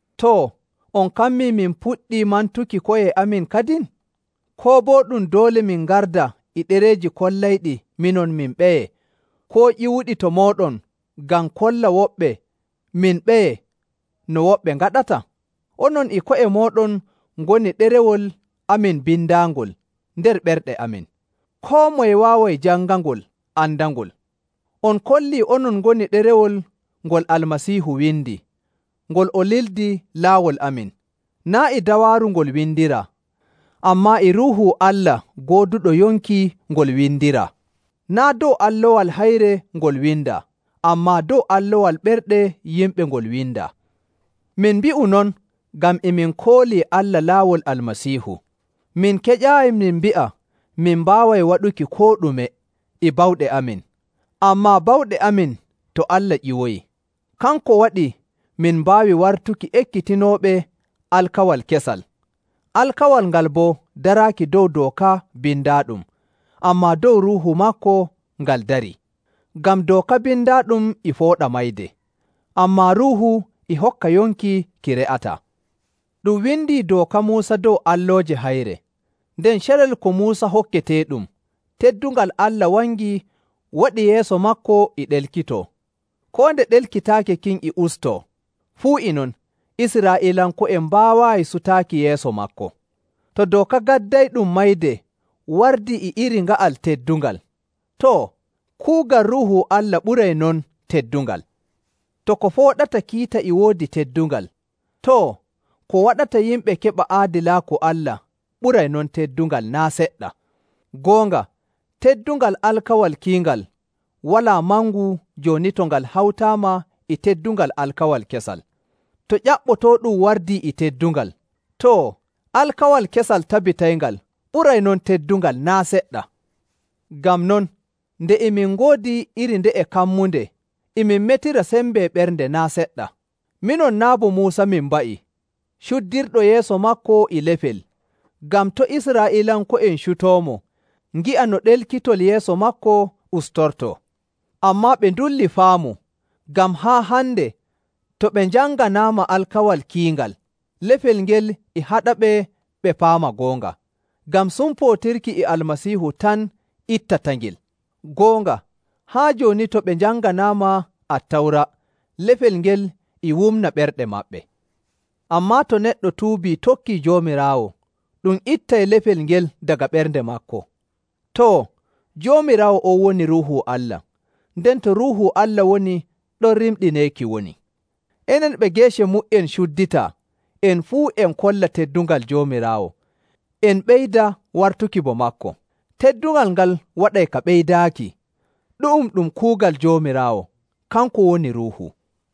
Too, on kammii min puɗɗii mantuki ko'e amin kadin? Koo boo ɗum doole min ngarda e ɗereeji kollayɗi minon min ɓeye, koo ƴiwuɗi to mooɗon ngam kolla woɓɓe min ɓeye no woɓɓe ngaɗata? Onon e ko'e mooɗon ngoni ɗerewol amin bindaangol nder ɓerɗe amin. Koo moye waaway jangangol andangol. On kollii onon ngoni ɗerewol ngol Almasiihu windi, ngol o lildi laawol amin. Naa' e dawaaru ngol windiraa, ammaa e Ruuhu Allah gooduɗo yonki ngol windiraa. Naa' dow allowal hayre ngol windaa, ammaa dow allowal ɓerɗe yimɓe ngol windaa. Min mbi'u non ngam e min koolii Allah laawol Almasiihu. Min keƴaayi min mbi'a min mbaaway waɗuki koo ɗume e bawɗe amin, ammaa bawɗe amin to Allah ƴiwoyi. Kanko waɗi min mbaawi wartuki ekkitinooɓe Alkawal Kesal. Alkawal ngal boo daraaki dow dooka bindaaɗum, ammaa dow Ruuhu maako ngal dari. Ngam dooka bindaaɗum e fooɗa mayde, ammaa Ruuhu e hokka yonki ki re'ataa. Ɗum windi dooka Muusa dow allooje hayre, nden carel ko Muusa hokketeeɗum, teddungal Allah wangi waɗi yeeso maako e ɗelkitoo. Koo nde ɗelkitaaki kin e ustoo, fuu e non Israa'iilanko'en mbaawaayi sutaaki yeeso maako. To dooka gaddayɗum mayde wardii e iri nga'al teddungal, too, kuugal Ruuhu Allah ɓuray non teddungal! To ko fooɗata kiita e woodi teddungal, too, ko waɗata yimɓe keɓa aadilaaku Allah ɓuray non teddungal naa' seɗɗa! Goonga, teddungal alkawal kiingal walaa mangu jooni to ngal hawtaama e teddungal alkawal kesal. To ƴaɓɓotooɗum wardii e teddungal, too, alkawal kesal tabitayngal ɓuray non teddungal naa' seɗɗa! Ngam non, nde e min ngoodi iri nde'e kammunde, e min metira sembe ɓernde naa' seɗɗa. Minon naa' bo Muusa min mba'i, cuddirɗo yeeso maako e lefel, ngam to' Israa'iilanko'en cutoomo ngi'a no ɗelkitol yeeso maako ustortoo. Ammaa ɓe ndullii faamu, ngam haa hande to ɓe njanganaama alkawal kiingal, lefel ngel e haɗaɓe ɓe paama goonga, ngam sumpootirki e Almasiihu tan ittatangel. Goonga, haa jooni to ɓe njanganaama Attawra, lefel ngel e wumna ɓerɗe maɓɓe. Ammaa to neɗɗo tuubii tokkii Joomiraawo, ɗum ittay lefel ngel daga ɓernde maako. Too, Joomiraawo on woni Ruuhu Allah, nden to Ruuhu Allah woni ɗon rimɗineeki woni. Enen ɓe geece mu''en cudditaa en fuu en kolla teddungal Joomiraawo en ɓeyda wartuki bo maako. Teddungal ngal waɗay ka ɓeydaaki. Ɗu'um ɗum kuugal Joomiraawo, kanko woni Ruuhu.